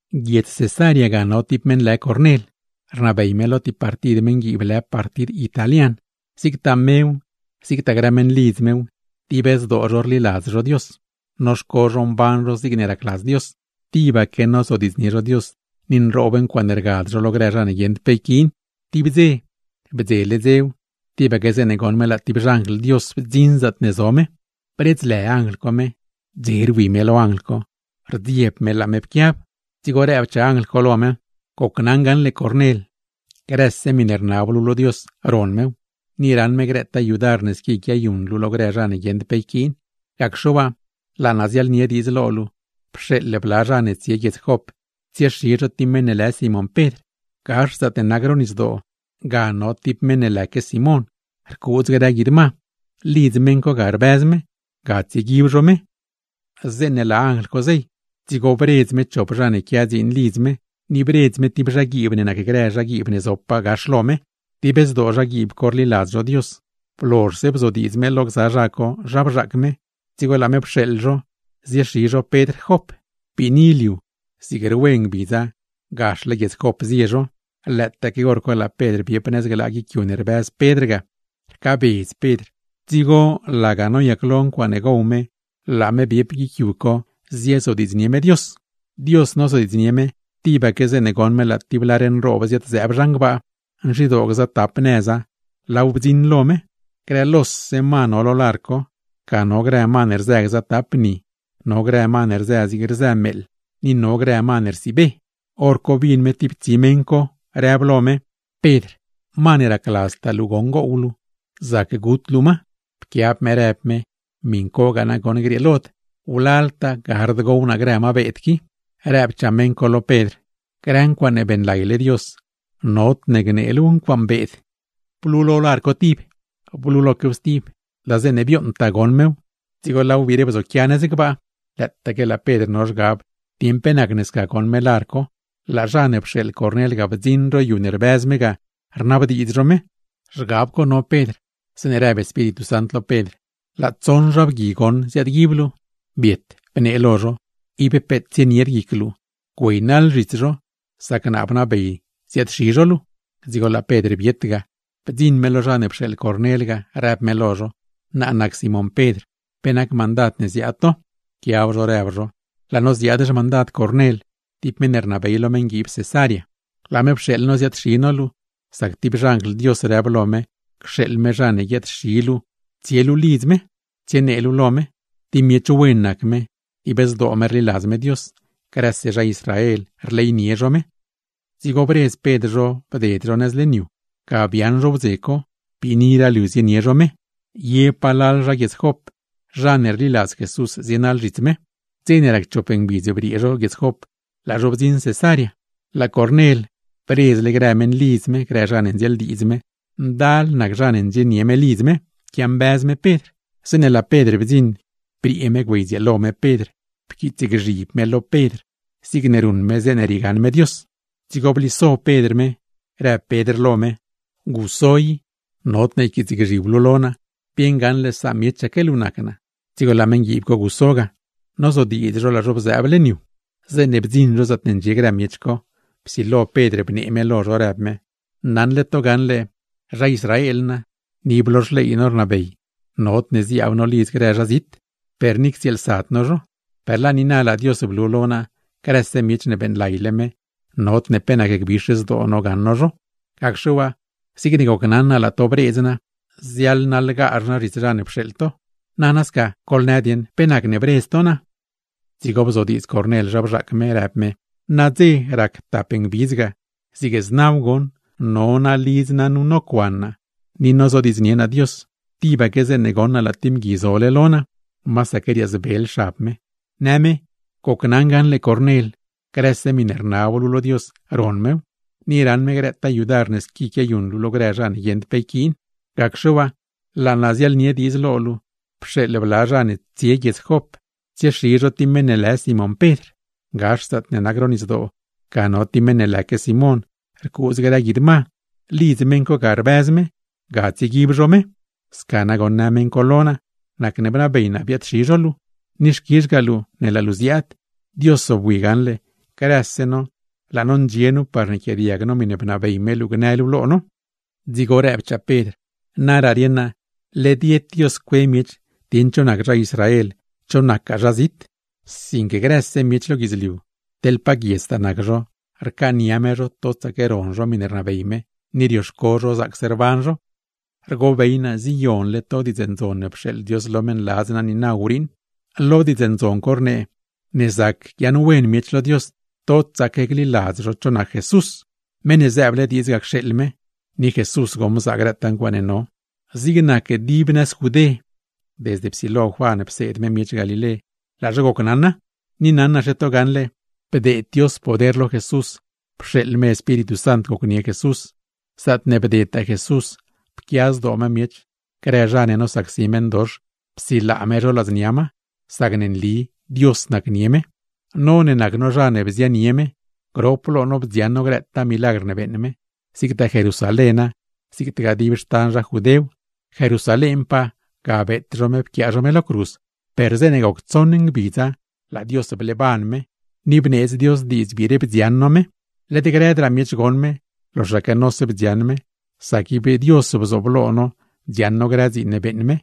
Guiedz Cesarea, ga no ti meṉ lë Cornel, rnabey me lo ti partid meṉguiib lë partid Italian. Zigtaa mew, zigtaa grë meṉlidz mew, dib zdoo zho rliladz zho Dios, noxco zho mban zho zigne racladz Dios. Tibaque nonab zho lo Dios, ni nroob ncuaaṉe rgad zho lo grë zha ne guieṉd pe yquiin. Tib dze, bdzele dzew tibaque zeeṉe goṉ me laa ti xanjl Dios bdziṉ zaatne zo me, bredzlë anjl co me. Dze rwi me lo anjl co, rdzieb me laa me pquiab. Dzigo rëbchaa anjl co lo me: ―Gocnaṉ gaṉle grëse miṉe rnab luu lo Dios ron mew, ni raṉ me grëtaa yudar ne squi quiayuṉ luu lo grë zha ne guieṉd pe yquiin. Gacxe waa, laa naa ziaḻnie diidz lo luu: pxeeḻ bla zha ne tsie guiedz Jop tsiexi zho ti meṉ ne lë Simón Pedr. Gax zaatne nac ro nisdoo, ga no ti meṉ lëque Simón, rcuudz me grë guid ma; lidz meṉ co ga rbëz me; ga tsieguib zho me. Zeeṉe laa anjl co zey, dzigo bredz me chop zha ne quia dziin lidz me, ni bredz me ti zhaguiib ne nacgrë zhaguiib ne zopaa gax lo me; dib zdoo zhaguiib co rliladz zho Dios. Blozhse bzodiidz me lo gza zha co zha bzhaac me, dzigo laa me pxeeḻ zho ziexi zho Pedr Jop. Biini liu, zig rwe ngbidza gaxle Jop zie zho. Lëëtaaque hor co laa Pedr biep nëz glaa guic yu ne rbëz me ga. Rcaabedz me, dzigo laga noyaclo ncuaaṉe gow me laa me biep guic yu co ziezodiidznie me Dios. Dios nozodiidznie me, tibaque zeeṉe goṉ me laa ti lar nroob ziad-zëëb zhan gbaa, nzhidoo gzatap nëza laaw bdziṉ lo me. Grë lose ma no lo lar co, ga no ma ne rzë gza tap ni, no grë ma ne rzë zigne rzë meeḻ, ni no grë ma ne rsiibe. Horco bin me ti tsi meṉ co, rëb lo me: ―Pedr, ma ne racladztaa luu gow luu zac gut luu ma. Pquiab me rëb me: ―¡Miṉ cogaa nagoṉ grieelod! Wlaltaa gard gow naa grë ma beed qui. Rëbchaa meṉ co lo Pedr: ―Grë ncuaaṉe beeṉlayle Dios, nodne gnee luuw ncuaaṉ beed. Blulo lar co tib, bluloquew stib, laa zeeṉe bioṉtaa goṉ mew dzigo laaw biire bzoquia nëz gbaa. Lëëtaaque laa Pedr no zhgab dieṉ pe nacne sca goṉ me lar co, laa zha ne pxeeḻ Cornel ga bdziṉ ro yu ne rbëz me ga, rnabdiidz zho me. Zhgab co no Pedr, zeeṉe rëb Espíritu Sant lo Pedr: ―Laa tsoṉ zha bgui goṉ ziaadguib luu. Biet, bnee lo zho. Ib peet tsienied guic luu güeynaḻ zhits zho, sac naa bnabey ziaad-xi zho luu. Dzigo laa Pedr biet ga, bdziṉ me lo zha ne pxeeḻ Cornel ga, rëb me lo zho: ―Naa nac Simón Pedr. ¿Pe nac mandad ne ziaad to? Pquiab zho rëb zho: ―Laa no ziaad xmandad Cornel, ti meṉ ne rnabey lo meṉguiib Cesarea. Laa me pxeeḻ no ziaad-xi no luu, sac ti xanjl Dios rëb lo me cxeeḻ me zha ne guiaad-xi luu tsie luu lidz me, tsienee luu lo me. Ti miech wen nac me, dib zdoo me rliladz me Dios, grëse zha Israel rleynie zho me. Dzigo bredz Pedr zho bded zho nëz leṉ yu; ga biaaṉ zho wdze co. Biiniraa liu zienie zho me, ye palal zha Jop, zha ne rliladz Jesús zienaḻ zhits me. Dze ne rac chop ngbidz briee zho Jop, laa zho bdziṉ Cesarea. Laa Cornel bredzle grë meṉlidz me, grë zha ne ndzieeldiidz me; ndal nac zha ne ndxienie me lidz me, quiambëz me Pedr. Zeeṉe laa Pedr bdziṉ, briee me güeydzieelo me Pedr, pquiitsgzhib me lo Pedr naṉ me niuṉ me Pedr zigne riegaṉ me Dios. Dzigo bliso Pedr me, rëb Pedr lo me: ―¡Guso i, nodne yquiitsgzhib luu lo naa! Bieṉ gaṉle samiechaque luu nac naa. Dzigo laa meṉguiib co guso ga. Nozodiidz zho laa zho bzëëb leṉ yu. Zeeṉe bdziṉ zho zaatne ndxie grë miech co, psilo Pedr bnee me lo zho, rëb me: ―Naṉle to gaṉle zha Israel naa, ni ib lo xley no rnabey nodne ziaab no lidz grë zha zit, per ni ctsieelsad no zho; per laa niina laa Dios blu lo naa, grëse miech ne beeṉlayle me nod pe nacne gbix zdoo naa gaṉ naa zho. Gacxe waa, zigne gocnaṉ naa laa to rbedz naa, ziaḻnaḻgazh naa zhits zha ne pxeeḻ to. Nana sca, goḻnë dieṉ pe nacne bredz to naa. Dzigo bzodiidz Cornel zha bzhaac me, rëb me: ―Nadze rac tap ngbidz ga, zig znaw goṉ, no naa lidz naa nu nocuan naa, ni nonab naa lo Dios. Tibaque zeeṉe goṉ naa laa ti mgui zole lo naa, masaque riaazbel xab me, në me: “Gocnaṉ gaṉle grëse miṉe rnab luu lo Dios ron mew, ni raṉ me grëtaa yudar ne squi quiayuṉ luu lo grë zha ne guieṉd pe yquiin. Gacxe waa, laa naa ziaḻnie diidz lo luu: pxeeḻ bla zha ne tsie guiedz Jop tsiexi zho ti meṉ ne lë Simón Pedr. Gax zaatne nac ro nisdoo, ga no ti meṉ lëque Simón, rcuudz me grë guid ma; lidz meṉ co ga rbëz me; ga tsieguib zho me.” Sca nagoṉ në meṉ co lo naa, nacne bnabey naa biaad-xi zho luu; ni xquizhgaa luu ne laa luu ziaad. Dios zobwi gaṉle, grëse no laa no ndxie nu par yquiaadiag no miṉe bnabey me luu gnë luu lo no. Dzigo rëbchaa Pedr: ―¡Naraa rieṉ naa, led yed Dios cue miech dieṉ cho nac zha Israel, cho nacgaa zha zit! Sinque grëse miech lo guidzliu, teḻ pa guiedztaa nac zho, rcaania me zho totsaque ron zho miṉe rnabey me, ni rioxco zho zaacse rban zho. Rgobey naa ziyonle to Diidz Ndzon ne pxeeḻ Dios lo meṉladz naa niina wriiṉ. Lo Diidz Ndzon co rnee, ne zac guiaaṉwen miech lo Dios, totsaque gliladz zho cho nac Jesús, meṉ ne zëëble diidz ga cxeeḻ me (ni Jesús goṉ bzaa grëtaa ncuaaṉe no). Zig nac dib Judé, desde ne psilo Juan pseed me miech Galilé, laa zho gocnaṉa. Ni naṉaxe to gaṉle, bdeed Dios poder lo Jesús, pxeeḻ me Espíritu Sant gocnie Jesús. Zaatne bdedtaa Jesús, pquia zdoo me miech, grë zha ne nosacsi meṉdox psilaa me zho ladznia ma; sacne nli Dios nacnie me. No ne nac no zha ne bzianie me, grop lo no bdziaṉ no grëtaa milagr ne beeṉ me, zigtaa Jerusaléna zigtagaa dib Judéw. Jerusalénpaa ga beet zho me pquiaa zho me lo cruz, per zeeṉe goc tsoṉ ngbidza laa Dios bleeban me, ni bneedz Dios diidz biire bdziaṉ no me. Led grëdraa miech goṉ me, loxaque nose bdziaṉ me; sac ib Dios bzooblo no dziaṉ no grë dziin ne beeṉ me.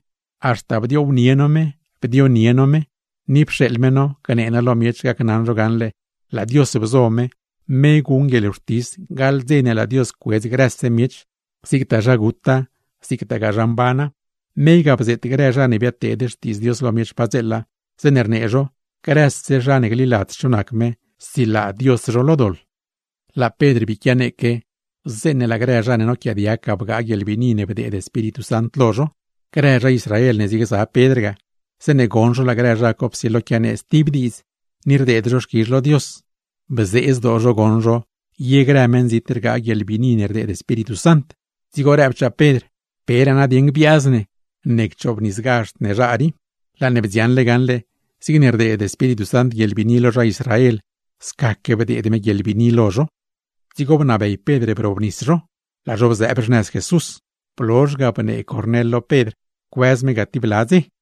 Haxta bdioownie no me, bdionie no me, ni pxeeḻ me no gnee no lo miech gacnaṉ zho gaṉle laa Dios bzo me, me guṉ guieḻwxtis gaḻ dze ne laa Dios cuedz grëse miech, zigtaa zha guta zigtagaa zha mbana. Me ga bzeet grë zha ne biadteed Xtiidz Dios lo miech padzeela, zeeṉe rnee zho: “Grëse zha ne gliladz cho nac me, silaa Dios zho lo doḻ.” Laa Pedr bii quianeeque, zeeṉe laa grë zha ne noquiaadiag ga bgaa guieḻbiini ne bdeed Espíritu Sant lo zho. Grë zha Israel ne ziegza Pedr ga, zeeṉe goṉ zho laa grë zha co psilo quianee stib diidz, ni rdeed zho xquizh lo Dios, bzee zdoo zho goṉ zho ye grë meṉzit rgaa guieḻbiini ne rdeed Espíritu Sant. Dzigo rëbchaa Pedr: ―¿Peraa nadieṉ gbiaaz ne, ne cchoobnisgazhd ne zha rii? Laa ne bdziaṉle gaṉle zigne rdeed Espíritu Sant guieḻbiini lo zha Israel, scaque bdeed me guieḻbiini lo zho. Dzigo bnabey Pedr brobnis zho, laa zho bzëëb xnëz Jesús. Blozh ga bnee Cornel lo Pedr cuëz me ga ti bla dze.